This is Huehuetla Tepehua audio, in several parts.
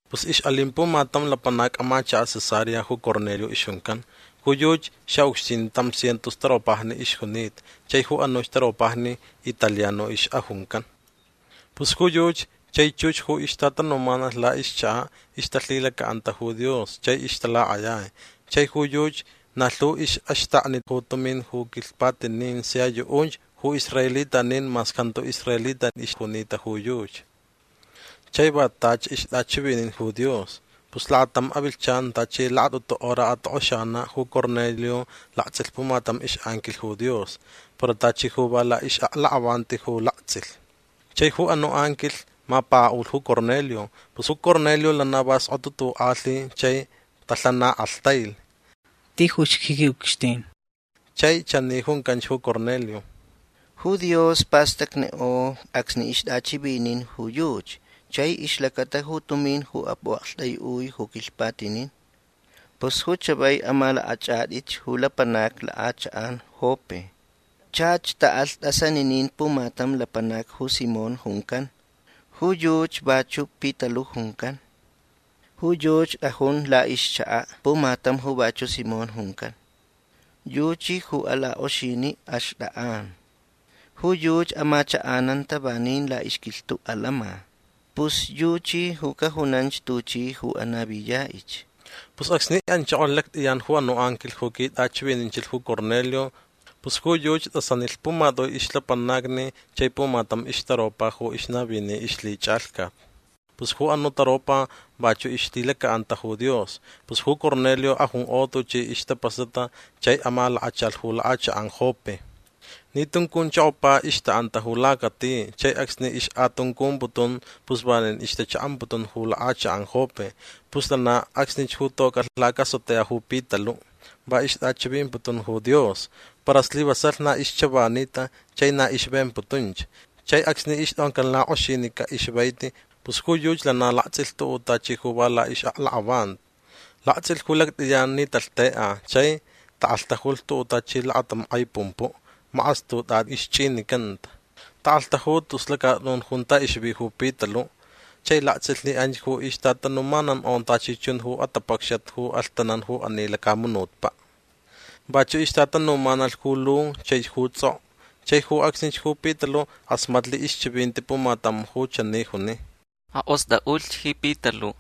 Pus ixʼalin pumatam lapanac amachakaʼ Cesarea ju Cornelio ixjuncan. Ju yuchi xaʼucxtin tam cientos taropajni ixjunita chai ju anuch taropajni Italiano ixʼajuncan. Pus ju yuchi chai chux ju ixtatanumanalh laʼixchakaʼ ixtalhilacaʼanta ju Dios chai ixtalakʼayai. Chai ju yuchi na lhu ixʼaxtakni ju tumin ju quilhpatinin sia yuʼunch ju israelitanin mas jantu israelita ixjunita ju yuchi. Chai va tachi ixtʼachivinin ju Dios. Pus lakatam avilhchan tachi lakatʼutu hora atokʼoxanaʼ ju Cornelio laktsʼilh pumatam ixʼanquilh ju Dios. Para tachi ju va laʼixʼaklakʼavanti ju laktsʼilh. Chai ju anuʼ anquilh mapakaʼulh ju Cornelio. Pus ju Cornelio lana va skotutukʼalhi chai talhanakʼalhtailh: ―Tijuch ji quiʼucxtin. Chai chani juncanch ju Cornelio: ―Ju Dios pastacnikʼo acsni ixtʼachʼivinin ju yuchi chai ixlacata ju tumin ju pʼuʼaktʼaiʼui ju quilhpatinin. Pus ju chavai amalakʼachʼatʼich ju lapanacni lakʼachakʼan Jope. Chach taʼalh tʼasaniniʼ pumatam lapanac ju Simón juncan. Ju yuchi vachuʼ Pitaluʼ juncan. Ju yuchi tʼajun laʼixchakaʼ pumatam ju vachuʼ Simón juncan. Yuchi ju alakʼoxiniʼ axtʼakʼan. Ju yuchi amachakʼananta vanin laʼixquilhtuʼ alama. Pus yuchi ju cajunanch tuchi ju anaviyaʼich. Pus acsni anchokolh lactʼiyan ju anuʼ anquilh ju quitʼachivininchilh ju Cornelio pus ju yuchi tʼasanilh pumatʼui ixlapanacni chai pumatam ixtaropa ju ixnavini ixlhichʼalhcat. Pus ju anuʼ taropa vachuʼ ixlhilacaʼanta ju Dios. Pus ju Cornelio ajunkʼo tuchi ixtapasata chai amalakachalh ju lakʼachakʼan Jope. Ni tuncunchokopa ixtaʼanta ju lacati chai acsni ixkʼatuncumputun pus vanin ixtachaʼamputun ju lakʼachakʼan Jope. Pus lana acsnich ju tocʼalh lacasotea ju Pitaluʼ. Va ixtʼachivimputun ju Dios. Para slivasalh na ixchavanita chai na ixvemputunch. Chai acsni ixtʼoncan lakʼoxinica ju ixvaiti pus ju yuchi lana laktsʼilh tuʼuʼ tachi ju va laʼixʼaklakʼavanti. Laktsʼilh ju lactʼiyan ni talhtekʼa chai takʼalhtajulh tuʼuʼ tachi lakatam kʼai pumpuʼ. Makʼastutʼatʼi ixchʼinicanta. Takʼalhtaju tus lacatʼun junta ixvi ju Pitaluʼ. Chai laktsʼilh ni anch ju ixtatanumanankʼo tachi chun ju atapacxat ju alhtanan ju ani lacamunutpaʼ. Vachuʼ ixtatanumanalh ju lu chaich ju tsʼokʼo. Chai ju acsnich ju Pitaluʼ kʼasmatlh ixchivinti pumatam ju chani juni: ―Akʼostʼaʼulhch ji Pitaluʼ.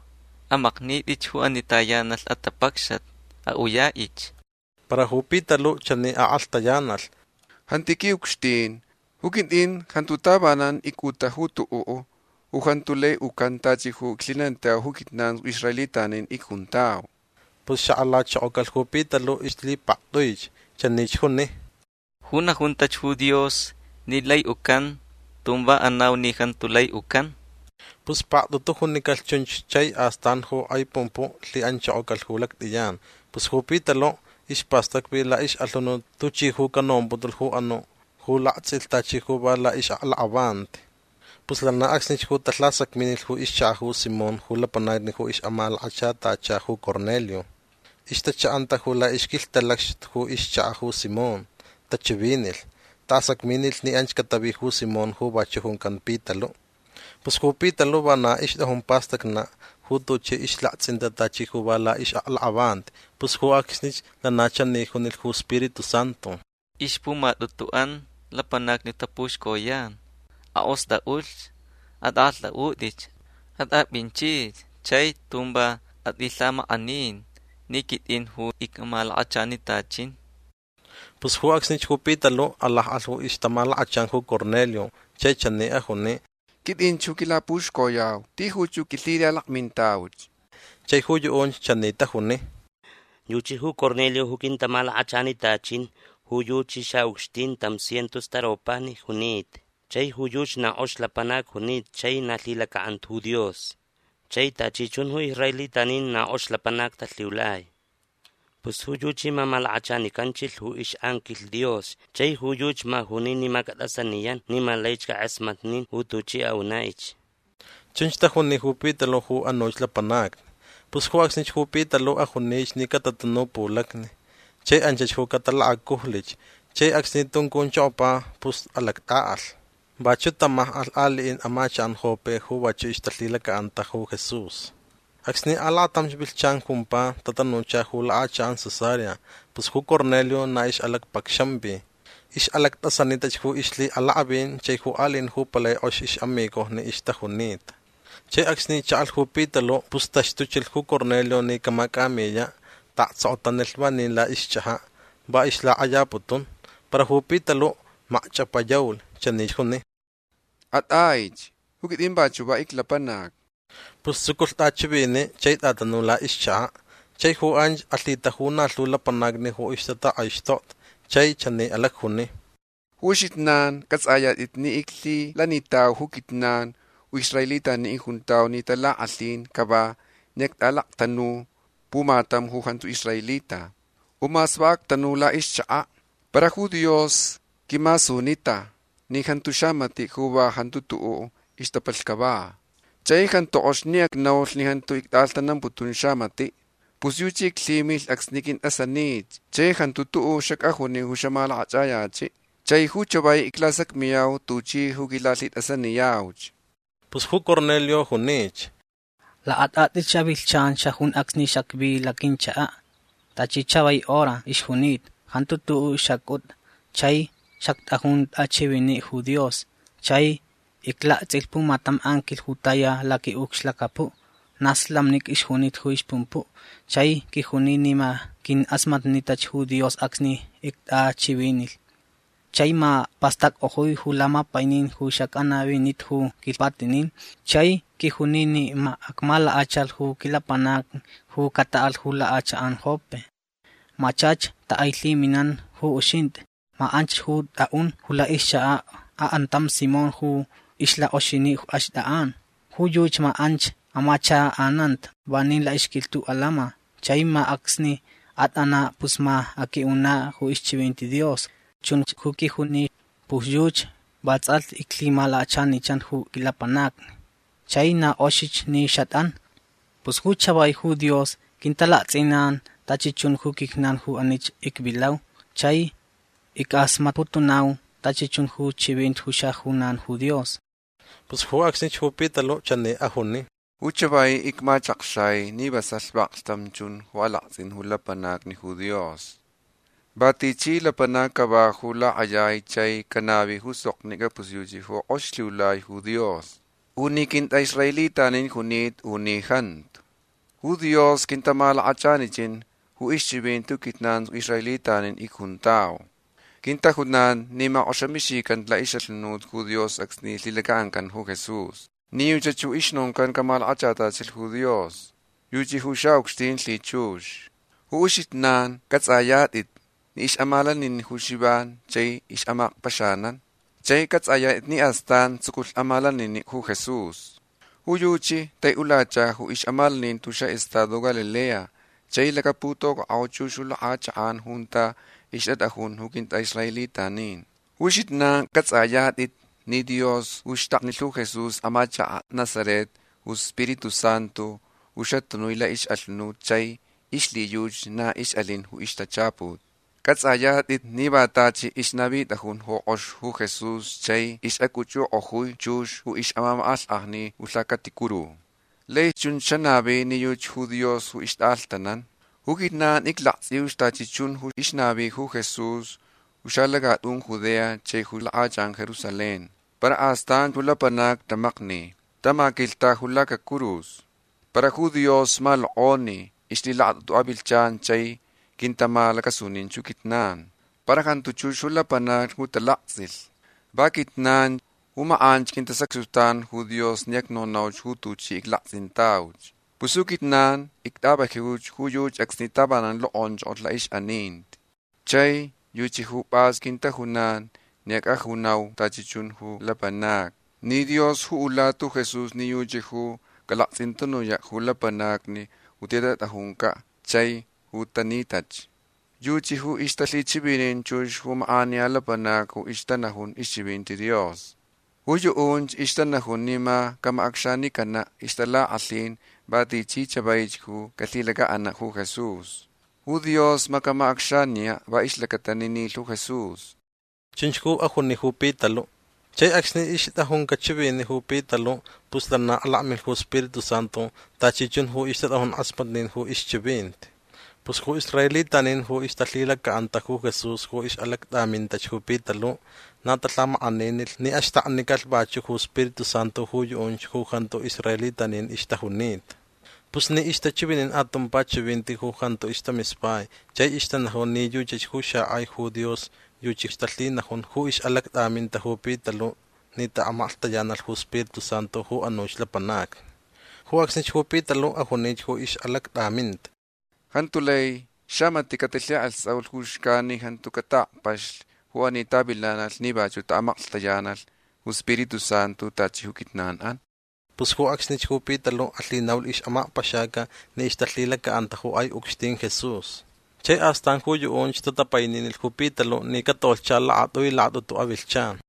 Amaknitʼich ju ani tayanalh atapacxat. Aʼuyaʼich. Para ju Pitaluʼ chani akʼalhtayanalh: ―Jantu ji quiʼucxtin. Ju quitʼin jantu tavanan icʼuta tuʼuʼ ju jantu lai ucan tachi ju iclhilanitau ju quijnan ju israelitanin icjuntau. Pus xakʼalachokocalh ju Pitaluʼ ixlhipaktʼuich. Chanich ju juni: ―Ju najuntach ju Dios ni lai ucan tun va anau ni jantu lai ucan. Pus paktʼutu ju junicalh chunch chai astan ju kʼai pumpuʼ lhiʼanchokocalh ju lactʼiyan. Pus ju Pitaluʼ ispastacvi laʼixʼalhunut tuchi ju canomputulh ju anuʼ ju laktsʼilh tachi ju va laʼixʼaklakʼavanti. Pus lana acsnich ju talhasacminilh ju ixchakaʼ ju Simón ju lapanacni ju ixʼamalakachanicantachilh ju Cornelio. Ixtachaʼanta ju laʼixquilhtalacxtutu ju ixchakaʼ ju Simón. Tachivinilh. Taʼasacminilh ni anch catavi ju Simón ju vachuʼ juncan Pitaluʼ. Pus ju Pitaluʼ vana ixtʼajun pastacnaʼ ju tuchi ixlaktsʼinta tachi ju va laʼixʼaklakʼavanti. Pus ju acsnich lana chani junilh ju Spiritu Santu: ―Ixpumatʼutuʼan lapanacni tapuxcoyan. Akʼostʼaʼulh. Atʼakʼalhtʼaʼutʼich. Atʼapʼinchich chai tun va atʼilhamakʼanin ni quitʼin ju icʼamalakachanitachin. Pus ju acsnich ju Pitaluʼ alakʼalh ju ixtamalakachan ju Cornelio chai chani ajuni: ―Quitʼinch ju quilapuxcoyau. Tijuch ju quilhilalakmintauch. Chai ju yuʼunch chani tajuni: ―Yuchi ju Cornelio ju quintamalakachanitachin. Ju yuchi xaʼucxtin tam cientos taropajni junita. Chai ju yuchi na kʼox lapanac junita chai na lhilacaʼanta ju Dios. Chai tachi chun ju israelitanin na kʼox lapanac talhiulai. Pus ju yuchi ma malakachanicanchilh ju ixʼanquilh Dios chai ju yuchi ma juni ni ma catʼasaniyan ni ma laich cakʼasmatnin ju tuchʼi aʼunaʼich. ―Chunch tajuni ju Pitaluʼ ju anuch lapanacni. Pus ju acsnich ju Pitaluʼ ajunich ni catatanu pulacni. Chai anch ju talakacujlich. Chai acsni tuncunchokopa pus alactʼaʼalh. Vachuʼ tamakʼalh aliʼin amachakʼan Jope ju vachuʼ ixtalhilacaʼanta Jesús. Acsni alakatamch avilhchan jumpa tatanucha ju lakʼachakʼan Cesarea. Pus ju Cornelio na ixʼalacpacxanvi. Ixʼalactʼasanitach ju ixlhiʼalakʼavin chai ju aliʼin ju palai kʼox ixʼamigojni ixtajunita. Chai acsni chaʼalh ju Pitaluʼ pus taxtuchilh ju Cornelio ni camacʼamiyaʼ. Taʼaktsokotanilh vanin laʼixchʼajaʼ. Va ixlakʼayaputun. Para ju Pitaluʼ makchʼapayaulh. Chanich juni: ―Atʼaich. Ju quitʼin vachuʼ va iclapanac. Pus tsuculh tʼachiviniʼ chai tʼatanu laʼixchakaʼ. Chai ju anch alhitaju na lhu lapanacni ju ixtatakʼaixtokta. Chai chani alacjuni: ―Ju uxijnan cʼatsʼayatʼit ni iclhilanitau ju quijnan ju israelitanin icjuntau ni talakʼalhin cava ni actʼalaktanu pumatam ju jantu israelita. U mas va actanu laʼixchakaʼ. Para ju Dios quimasunita ni jantu xamatiʼ ju va jantu tuʼuʼ ixtapalhni cava. Chai jantu kʼox ni acnaulh ni jantu ictʼaʼalhtanamputun xamatiʼ. Pus yuchi iclhimilh acsni qʼuintʼasanich chai jantu tuʼuʼ xacʼajuni ju xamalakʼachʼayachiʼ. Chai ju chavai iclasacmiyau tuchi ju quilalhitʼasaniyauch. Pus ju Cornelio junich: ―Lakatʼatʼich avilhchan xajun acsni xacvi laquinchakaʼ. Tachi chavai hora ixjunita. Jantu tuʼu xacʼuta chai xactʼajun tʼachiviniʼ ju Dios. Chai iclaktsʼilh pumatam anquilh ju taya laquiʼucxlacapuʼ. Na slamnica ixjunita ju ixpumpuʼ. Chai quijuni ni ma quinkʼasmatnitach ju Dios acsni ictʼachivinilh. Chai ma pastackʼojui ju lamapainin ju xacʼanavinita ju quilhpatinin. Chai quijuni ni ma acmalakachalh ju quilapanacni ju cataʼalh ju lakʼachakʼan Jope. Ma chach takʼailhiminan ju uxintʼi. Ma anch ju tʼaʼun ju laʼixchakaʼ akʼantam Simón ju ixlakʼoxiniʼ axtʼakʼan. Ju yuchi ma anch amachakʼananta vanin laʼixquilhtuʼ alama. Chai ma acsni atʼanaʼ pus ma aqʼuiʼunaʼ ju ixchivinti Dios. Chunch ju quijuni. Pus yuchi vatsʼalhti iclhimalakachanichan ju quilapanacni. Chai na kʼoxich ni xatʼan. Pus ju chavai ju Dios quintalaktsʼinan tachi chun ju quijnan ju anich icvilau chai ickʼasmatputunau tachi chun ju chivinti ju xajunan ju Dios. Pus ju acsnich ju Pitaluʼ chani ajuni: ―Ju chavai icmachakxai ni vasalh vaklhtam chun ju alaktsʼin ju lapanacni ju Dios. Va tichi lapanac cava ju lakʼayai chai canavi ju soknicʼa pus yuchi ju kʼox lhiulai ju Dios. U ni quintʼaʼisraelita junita u ni jantu. Ju Dios quintamalakachanichin ju ixchivinti ju quijnan ju israelitanin icjuntau. Quintajunan ni makʼoxamixican laʼixʼalhunut ju Dios acsni lhilacaʼancan ju Jesús ni yuchach ju ixnoncan camalakachatachilh ju Dios. Yuchi ju xaʼucxtin lhichux. Ju uxijnan cʼatsʼayatʼitch ni ixʼamalaninin ju Xivan chai ixʼamakpaxanan. Chai cʼatsʼayatʼit ni astan tsuculh amalaninin ju Jesús. Ju yuchi taiʼulacha ju ixʼamalaninti ju xaʼestado Galilea chai lacaputocʼakʼo chux ju lakʼachakʼan junta ixtatʼajun ju quintʼaʼisraelitanin. Ju uxijnan cʼatsʼayatʼit ni Dios ju xtaknilh ju Jesús amachakaʼ Nazaret ju Spiritu Santu ju xatanui laʼixʼalhunut chai ixlhiyuchi na ixʼalin ju ixtachaput. Cʼatsʼayatʼit ni va tachi ixnavitʼajun ju kʼox ju Jesús chai ixʼacʼuchʼukʼojui chux ju ixmamakʼalhkʼajni ju lhacaticuru. Lai chunch xanavi ni yuchi ju Dios ju ixtʼaʼalhtanan. Ju quijnan iclaktsʼiuch tachi chun ju ixnavi ju Jesús ju xalacatʼun Judea chai ju lakʼachakʼan Jerusalén. Para astan ju lapanacni tamakni. Tamaquilhta ju lacacurus. Para ju Dios malokʼoni ixlhilakatʼutu avilhchan chai quintamalacasunin ju quijnan. Para jantu chux ju lapanacni ju talaktsʼilh. Va quijnan ju makʼanch quintasacxtutanch ju Dios ni acnonauch ju tuchi iclaktsʼintauch. Pus ju quijnan ictʼavajiuch ju yuchi acsni tavanan lokʼonchokolh laʼixʼaninti. Chai yuchi ju pʼas quintajunan ni acʼajunau tachi chun ju lapanacni ni Dios ju ulata ju Jesús ni yuchi ju calaktsʼintanuyach ju lapanacni ju titʼajuncaʼ chai ju tanitach. Yuchi ju ixtalhichivinin chux ju makʼaniya lapanacni ju ixtanajun ixchivinti Dios. Ju yuʼunch ixtanajun ni ma camacʼacxanicanaʼ ixtalakʼalhin va tichi chavaich ju calhilacaʼanaʼ ju Jesús. Ju Dios ma camacʼacxaniyaʼ va ixlacata ni nilh ju Jesús. ―Chunch ju ajuni ju Pitaluʼ. Chai acsni ixtʼajuncaʼ chiviniʼ ju Pitaluʼ pus lana alakmilh ju Spiritu Santu tachi chun ju ixtatʼajun kʼasmatnin ju ixchivinti. Pus ju israelitanin ju ixtalhilacaʼanta ju Jesús ju ixʼalactʼamintach ju Pitaluʼ na talhamakʼaninilh ni axtaknicalh vachuʼ ju Spiritu Santu ju yuʼunch ju jantu israelitanin ixtajunita. Pus ni ixtachivinin atumpa chivinti ju jantu ixtamispai chai ixtanajun ni yuchach ju xakʼai ju Dios yuchi ixtalhinajun ju ixʼalactʼaminta ju Pitaluʼ ni taʼamaklhtayanalh ju Spiritu Santu ju anuch lapanacni. Ju acsnich ju Pitaluʼ ajunich ju ixʼalactʼaminta: ―Jantu lai xamatiʼ catilhikʼalhtsʼaulh ju xcan ni jantu cataʼakpaxlh ju anich tavilanalh ni vachuʼ taʼamaklhtayanalh ju Spiritu Santu tachi ju quijnanʼan. Pus ju acsnich ju Pitaluʼ alhinaulh ixʼamakpaxaca ni ixtalhilacaʼanta ju kʼai ucxtin Jesús. Chai astan ju yuʼunch tatapaininilh ju Pitaluʼ ni catolhcha lakatʼui lakatʼutu avilhchan.